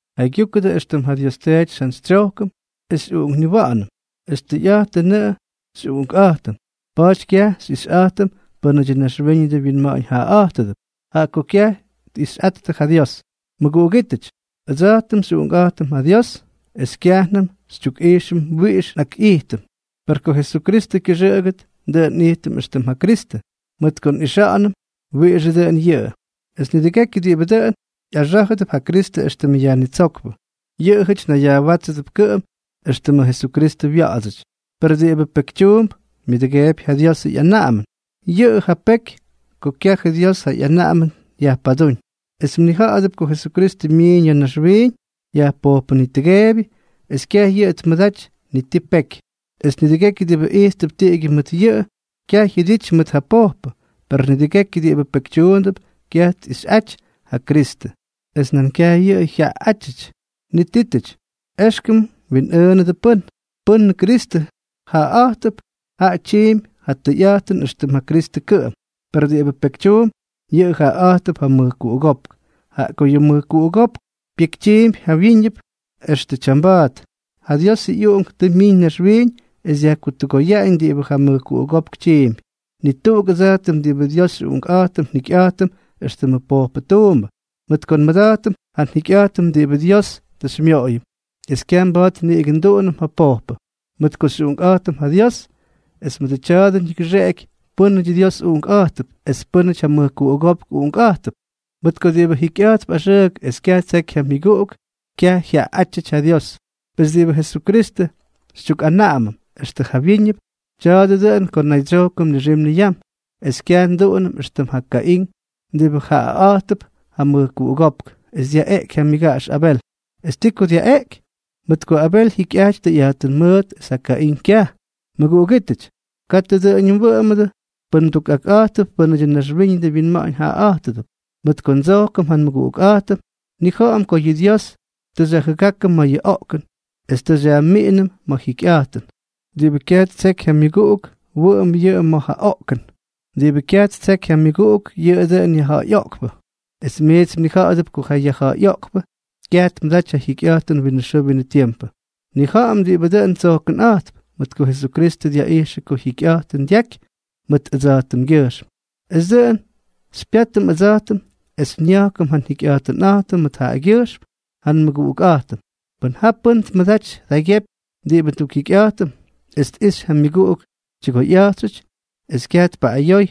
Jaygyúkʉdʉ éxtʉm ja Dios Teety xyjantsytsyojkʉm es xyꞌuꞌunkniwa̱ꞌa̱nʉm. Es tʉyꞌa̱jtʉnʉꞌʉ xyꞌuꞌunkꞌa̱jtʉm. Pa̱a̱ty kyaj xyꞌixyꞌa̱jtʉm pʉ́nʉdyʉ naxwíñʉdʉ winma̱ꞌa̱ñ jaꞌaꞌa̱jtʉdʉp, jaꞌa ko kyaj tꞌixyꞌattʉ ja Dios. Mʉguꞌugítʉty, ʉdsa̱jtʉm xyꞌuꞌunkꞌa̱jtʉm ja Dios. Es kyajnʉm xytyukꞌijxʉm wiꞌix nꞌakꞌijtʉm, per ko Jesukristʉ kyʉxʉꞌʉgʉt, dʉꞌʉn nꞌijtʉm éxtʉm ja Kristʉ, mʉt ko nꞌixa̱ꞌa̱nʉm wiꞌixʉ dʉꞌʉn yʉꞌʉ. Es nidʉgekyʉ diꞌibʉ dʉꞌʉn ꞌyaxá̱jʉdʉp ja Kristʉ éxtʉmʉ Yajnitsókpʉ, yʉꞌʉjʉty nayyajwátsʉp kʉꞌʉm éxtʉmʉ Jesukristʉ wya̱ꞌa̱dsʉty. Per diꞌibʉ pekytyuump myʉdʉgeepy ja Diosʉ ꞌyanaꞌamʉn. Yʉꞌʉ ja peky ko kyajʉ Dios ja ꞌyanaꞌamʉn yajpadúñ. Es mnija̱ꞌa̱dʉp ko Jesukristʉ myiiñ ya̱ naxwiiñ yajpojpʉnitʉgeebyʉ, es kyaj yʉꞌʉ tmʉdaty ni ti peky. Es nidʉgekyʉ diꞌibʉ ijttʉp tiꞌigyʉ mʉt yʉꞌʉ, kyaj jyʉdity mʉt ja pojpʉ. Per nidʉgekyʉ diꞌibʉ pekytyuundʉp, kyaj tꞌixyꞌaty ja Kristʉ, es nan kyaj yʉꞌʉ jyaꞌaꞌátyʉty. Nitítʉty, éxkʉm mwinꞌʉʉnʉdʉ pʉ́n. Pʉ́nʉ Kristʉ jaꞌaꞌa̱jtʉp, jaꞌa tyiimpy ja tʉyꞌa̱jtʉn éxtʉm ja Kristʉ kʉꞌʉm. Per diꞌibʉ pekytyuump, yʉꞌʉ jaꞌaꞌa̱jtʉp ja mʉjkuꞌugópk, jaꞌa ko yʉ mʉjkuꞌugópk pyekytyiimpy jawyíñʉp extʉ tyamba̱a̱t. Yʉ Diosʉ ꞌyUꞌunk tʉ myiñ naxwiiñ es dyajkutʉgoyaꞌañ diꞌibʉ ja mʉjkuꞌugópk tyiimpy. Ni tuꞌuk ʉdsa̱jtʉm diꞌibʉ Dios xyꞌuꞌunkꞌa̱jtʉm njikyꞌa̱jtʉm éxtʉmʉ pojpʉ tuumbʉ, mʉt ko nmʉda̱jtʉm ja jikyꞌa̱jtʉn diꞌibʉ Dios tʉ xymyoꞌoyʉm es kyaj mba̱a̱t niꞌigʉ nduꞌunʉm ja pojpʉ, mʉt ko xyꞌuꞌunkꞌa̱jtʉm ja Dios. Es mʉdʉ tya̱a̱dʉ ñigʉxeꞌeky pʉ́nʉdyʉ Dios uꞌunkꞌa̱jttʉp es pʉ́nʉty ja mʉjkuꞌugópk uꞌunkꞌa̱jttʉp. Mʉt ko diꞌibʉ jikyꞌa̱jtp axʉʉk es kyaj ttseky ja myʉguꞌuk, kyaj jyaꞌaꞌátyʉty ja Dios. Pes diꞌibʉ Jesukristʉ xytyukꞌanaꞌamʉm extʉ jawyíñʉp, tya̱a̱dʉ dʉꞌʉn ko nnaydsyojkʉm nixim niyam, es kyaj nduꞌunʉm éxtʉm ja Kaín diꞌibʉ jaꞌaꞌa̱jtʉp ja mʉjkuꞌugópk es dyaꞌeꞌky ja myʉgaꞌax Abel. ¿Es ti ko dyaꞌeꞌky? Mʉt ko Abel jyikyꞌaty tʉyꞌa̱jtʉn mʉʉt es ja Kaín kyaj. Mʉguꞌugítʉty, katʉ dʉꞌʉñʉ mwʉꞌʉmʉdʉ pʉn mdukꞌakꞌa̱jtʉdʉp pʉ́nʉdyʉ naxwíñʉdʉ winma̱ꞌa̱ñ jaꞌaꞌa̱jtʉdʉp. Mʉt ko ndsojkʉm ja nmʉguꞌukꞌa̱jtʉm, nnija̱ꞌa̱m ko yʉ Dios tʉ xyajjʉgákʉm ma̱ yʉ oꞌkʉn es tʉ xyajmiꞌinʉm ma̱ yʉ jikyꞌa̱jtʉn. Diꞌibʉ kyaj ttseky yʉ myʉguꞌuk, wʉꞌʉmp yʉꞌʉ ma̱ ja oꞌkʉn. Diꞌibʉ kyaj ttseky ja myʉguꞌuk, yʉꞌʉ dʉꞌʉn yajja̱ꞌa̱yꞌoꞌkpʉ. Es miits mnija̱ꞌa̱dʉp ko ja yajja̱ꞌa̱yꞌoꞌkpʉ kyaj tmʉdaty ja jikyꞌa̱jtʉn winʉ xʉʉ winʉ tiempʉ. Nnija̱ꞌa̱m diꞌibʉ dʉn tsojkʉnꞌa̱jtp, mʉt ko Jesukristʉ dyaꞌijxʉ ko jyikyꞌa̱jtʉn dyajky mʉt ʉdsa̱jtʉmgyʉjxm. Es dʉꞌʉn xypyátʉm ʉdsa̱jtʉm es nya̱jkʉm ja njikyꞌa̱jtʉnꞌa̱jtʉm mʉt jaꞌagyʉjxm ja nmʉguꞌukꞌa̱jtʉm. Pʉn ja pʉ́n tmʉdaty tjaygyepy diꞌibʉ ndukjikyꞌa̱jtʉm, es tꞌixy ja myʉguꞌuk tyʉgoyꞌa̱jtxʉty, es kyaj tpaꞌꞌayoy,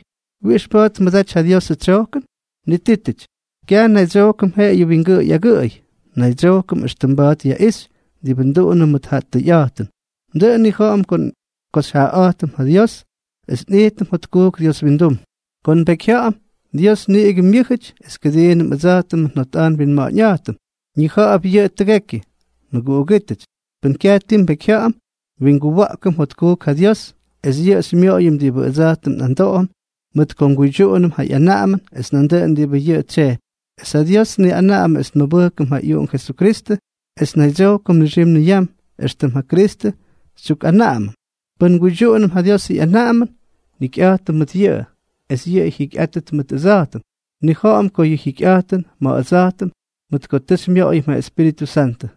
¿wiꞌix mba̱a̱t tmʉdaty ja Diosʉ tsyojkʉn? Nitítʉty, kyaj nnaydsyojkʉm jeꞌeyʉ wingʉꞌʉy agʉꞌʉy, naydsyojkʉm éxtʉm mba̱a̱t yaꞌixy diꞌibʉ nduꞌunʉm mʉt ja tʉyꞌa̱jtʉn. Dʉꞌʉn nnija̱ꞌa̱m ko xyjaꞌaꞌa̱jtʉm ja Dios es nꞌijtʉm jotkujk Dios windum ko nbekyjya̱ꞌa̱m, Dios niꞌigʉ myʉ́jʉty es kʉdiinʉm ʉdsa̱jtʉmʉ njotꞌa̱jt nwinma̱ꞌa̱ñꞌa̱jtʉm, ñija̱ꞌa̱p yʉꞌʉ tʉgekyʉ. Mʉguꞌugítʉty, pʉn kyaj ti nbekyjya̱ꞌa̱m, nwinguwa̱ꞌkʉm jotkujk ja Dios, es yʉꞌʉ xymyoꞌoyʉm diꞌibʉ ʉdsa̱jtʉm nꞌamdoꞌom, mʉt ko nguydyuꞌunʉm ja ꞌyanaꞌamʉn es nduꞌunʉm diꞌibʉ yʉꞌʉ tsyejpy. Es ja Dios tniꞌanaꞌamʉ es nmʉbʉjkʉm ja ꞌyUꞌunk Jesukristʉ es nnaydsyojkʉm nixim niyam, éxtʉm ja Kristʉ xytyukꞌanaꞌamʉm. Pʉn nguydyuꞌunʉm ja Diosʉ ꞌyanaꞌamʉn, jikyꞌa̱jtʉm mʉt yʉꞌʉ, es yʉꞌʉ jyikyꞌaty mʉt ʉdsa̱jtʉm. Nnija̱ꞌa̱m ko yʉꞌʉ jyikyꞌaty ma̱ ʉdsa̱jtʉm, mʉt ko tʉ xymyoꞌoyʉm ja Espíritʉ Santʉ.